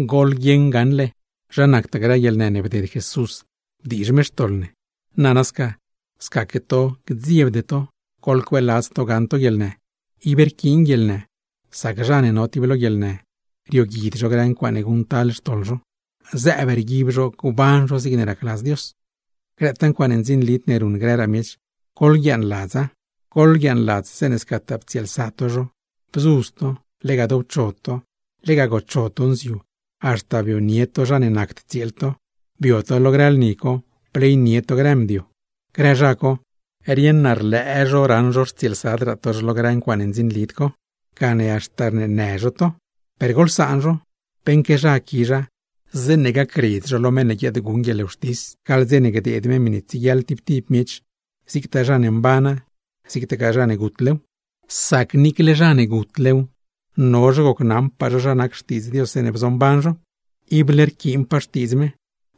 Goḻguieṉ gaṉle, zha nactaa grë guieḻnë ne bded Jesús bdiizh me xtoḻ ne; nana sca, scaque to gdziebde to goḻcueeladz to gaṉ to guieḻnë. Ib rquiin guieḻnë, sac zha ne no tib lo guieḻnë, rioguid zho grë ncuaaṉe guṉctal xtoḻ zho, zëëb rguib zho gban zho zigne racladz Dios. Grëtaa ncuaaṉe ndzinlid ne ruṉ grëraa miech, goḻguiaaṉladza. Goḻguiaaṉladz zeeṉe scataa ptsieelsa to zho, bzudz to, lega dowcho, lega gocho to nziu, haxta bionie to zha ne nacd tsieel to; bio to lo grë lni, bleynie to grë mdio. Grë zha co, rieṉ naa rlëë zho raṉ zho rtsieelsadraa to zho lo grë ncuaaṉe ndzinlid co, gane haxta rneenë zho to. Per goḻsaan zho, beṉque zha quizha zeeṉe gacredz zho lo meṉ ne guiaadguṉ guieḻwxtis, gaḻ dze ne gdeed me miṉe tsieguiaḻ tib tib miech, zigtaa zha mbana, zigtagaa zha ne gutlew. Sac niicle zha ne gutlew, no zho gocnaṉpaa zho zha nac Xtiidz Dios zeeṉe bzomban zho. Ible rquiinpaa Xtiidz me,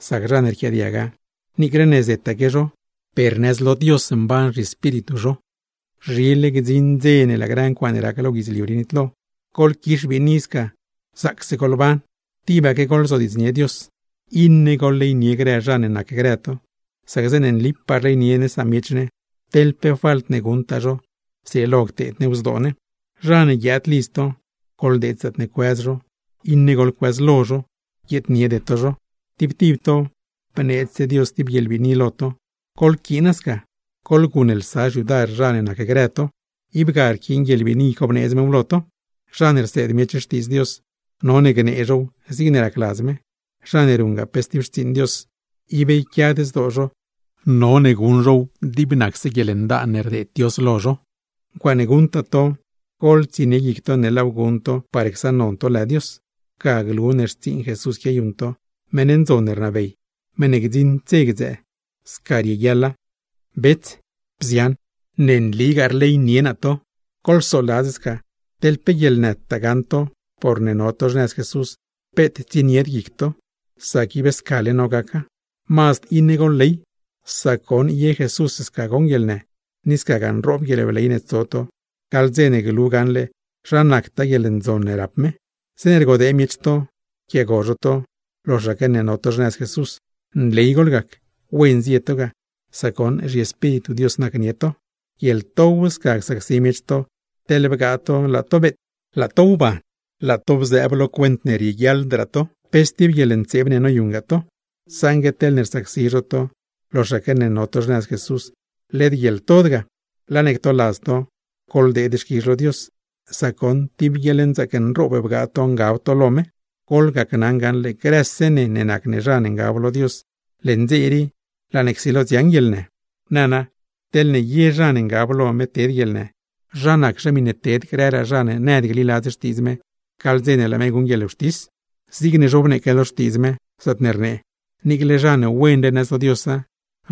sac zha ne rquiaadiaga, niicle ne zetaque zho, per nëz lo Dios mban zhiespíritu zho. Zhile gdziṉ gdze ne laa grë ncuaaṉe rac lo guidzliu rii nitlo; goḻquix biini zaacse goḻban, tibaque goḻzodiidznie Dios. Iṉe goḻleynie grë zha ne nacgrë to, sac zeeṉe nlipaa rleynie ne samiech ne, teḻ pe falt ne guṉtaa zho zrieelo cteed new zdoo ne. Zha ne guiaad lidz to, goḻdeed zaatne cuëz zho; iṉe goḻcuëzlo zho, guieedniede to zho. Tib tib to bneedzse Dios tib guieḻbiini lo to. ¡Goḻquiina sca, goḻguṉlsa xyudar zha ne nacgrë to! Ib ga rquiin guieḻbiini co bneedz mew lo to. Zha ne rseed miech Xtiidz Dios, none gnee zhow zigne racladz me. Zha ne ruṉgaa pe stib xtsiiṉ Dios, ib yquiad zdoo zho none guṉ zhow dib nacse guieḻndaan ne rdeed Dios lo zho. Ncuaaṉe guṉtaa to, goḻtsienie guic to ne laaw guṉ to par csaṉnon to lë Dios. Ga glu ne xtsiiṉ Jesús quiayuṉ to, meṉ ndzon ne rnabey, meṉ ne gdziṉd dze gdzëë. Sca rieguiaḻa. Bets, bzian, ne nligaa rleynie naa to. Goḻsoladz sca, teḻ pe guieḻnëtaa gaṉ to porne no to xnëz Jesús, peet tsienied guic to, sac ib scale no gaca. Mazd iṉe goḻley; sac goṉ ye Jesús sca goṉ guieḻnë, ni scagaa nroob guieḻbley ne tso to gaḻ dze ne glu gaṉle zha nactaa guieḻndzon ne rap me. Zeeṉe rgodee miech to, rquiaago zho to loxaque ne no to xnëz Jesús, nley goḻgac; wen zie to ga, sac goṉ zhiEspíritu Dios nacnie to. Guieḻtow sca csacsi miech to, teḻne bgaa to laa to beet, laa to wban, laa to bzëëb lo cuent ne rieguiaḻdraa to, pe stib guieḻntseeb ne noyuṉragaa to. Saṉgue teḻne rsacsi zho to loxaque ne no to xnëz Jesús, led guieḻtod ga. Laa ne ctoladz to, ¡goḻdeed xquizh lo Dios, sac goṉ tib guieḻnzaac nroob bgaa to ngab to lo me! Goḻgacnaṉ gaṉle, grëse ne ne nac ne zha ne ngab lo Dios, leṉ dze rii laa ne csilo dziaṉ guieḻnë. Nana, teḻne ye zha ne ngab lo me ted guieḻnë, ¿zha naczhe miṉe ted grëraa zha ne nëd gliladz Xtiidz me, gaḻ dze ne laa me guṉ guieḻwxtis? Zigne zhobneeque lo Xtiidz me, zaatne rnee: “Niicle zha ne wenle nëz lo Diosa,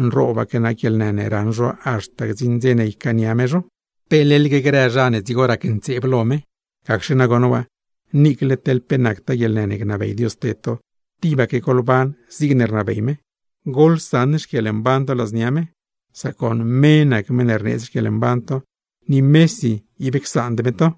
nroobaque nac guieḻnë ne raṉ zho haxta gdziṉ dze ne ycaania me zho, ¿pe leḻgue grë zha ne dzigo racntseeb lo me?” Gacxe nagoṉ waa, niicle teḻ pe nactaa guieḻnë ne gnabey Dios ted to, tibaque goḻban zigne rnabey me, goḻsaṉ xquieḻmban to ladznia me; sac goṉ me nac meṉ ne rneedz xquieḻmban to, ni mesi ib csaand me to.